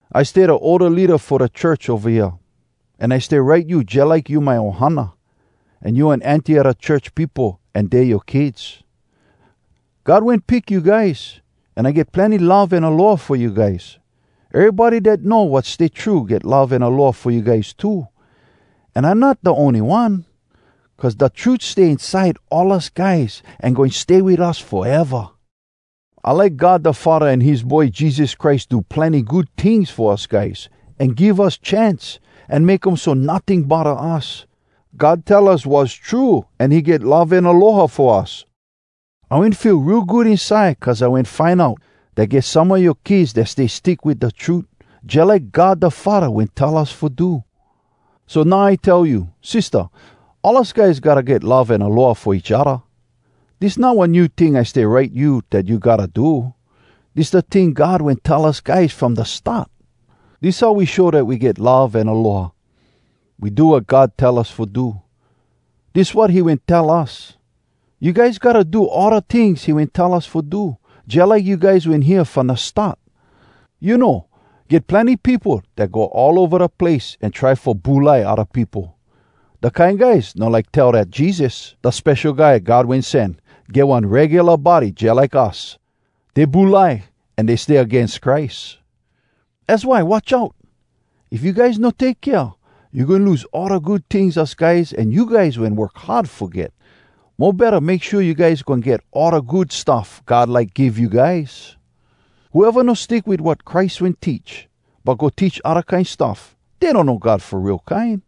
I stay da older leada fo da church ova hea, an I stay write you jalike you my ohana, an you one auntie a da church peopo an dey yoa kids. God wen pick you guys, an I get plenny love an aloha fo you guys. Erybody dat know wat stay true get love an aloha fo you guys too. An I not da ony one, cuz da trut stay inside all us guys an goin stay wit us foeva! I like God da Faddah an his Boy Jesus Christ do plenny good tings fo us guys, an give us chance, an make um so notting bodda us. God tell us wass true an he get love an aloha fo us. I wen feel real good inside cuz I wen find out dat get some a yoa kids dat stay stick wit da trut, jalike God da Faddah wen tell us fo do. So now I tell you, sistah, all us guys gotta get love an aloha fo each odda. Dis not one new ting I stay write you dat you gotta do. Dis da ting God wen tell us guys from da start. Dis how we show dat we get love an aloha: We do wat God tell us fo do. Dis wat he wen tell us, you guys gotta do all da tings he wen tell us fo do, jalike you guys wen hear from da start. You know, get plenny peopo dat go all ova da place an try fo bulai odda peopo. Dat kine guys no like tell dat Jesus, da Spesho Guy God Wen Sen, get one regula body jalike us! Dey bulai, an dey stay agains Christ. Az why watch out! If you guys no take kea, you goin lose all da good tings us guys an you guys wen work hard fo get. Mo betta make shua you guys goin get all da good stuff God like give you guys. Whoeva no stick wit wat Christ wen teach, but go teach odda kine stuff, dey donno God fo real kine.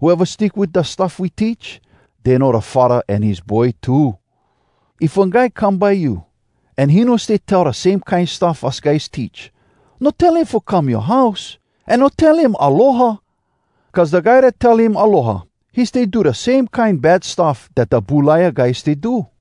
Whoeva stick wit da stuff we teach, dey know da Faddah an his Boy too. If one guy come by you, an he no stay tell da same kine stuff us guys teach, no tell him fo come yoa house, an no tell him “Aloha.” Cuz da guy dat tell him “Aloha,” he stay do da same kine bad stuff dat da bulaia guy stay do.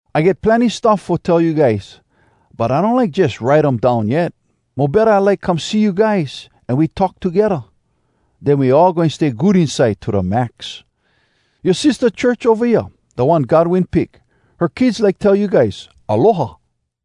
I get plenny stuff fo tell you guys, but I no like jus write um down yet. Mo betta I like come see you guys, an we talk togedda. Den we all goin stay good inside to da max. Yoa sistah church ova hea, da one God wen pick, her kids like tell you guys “Aloha.”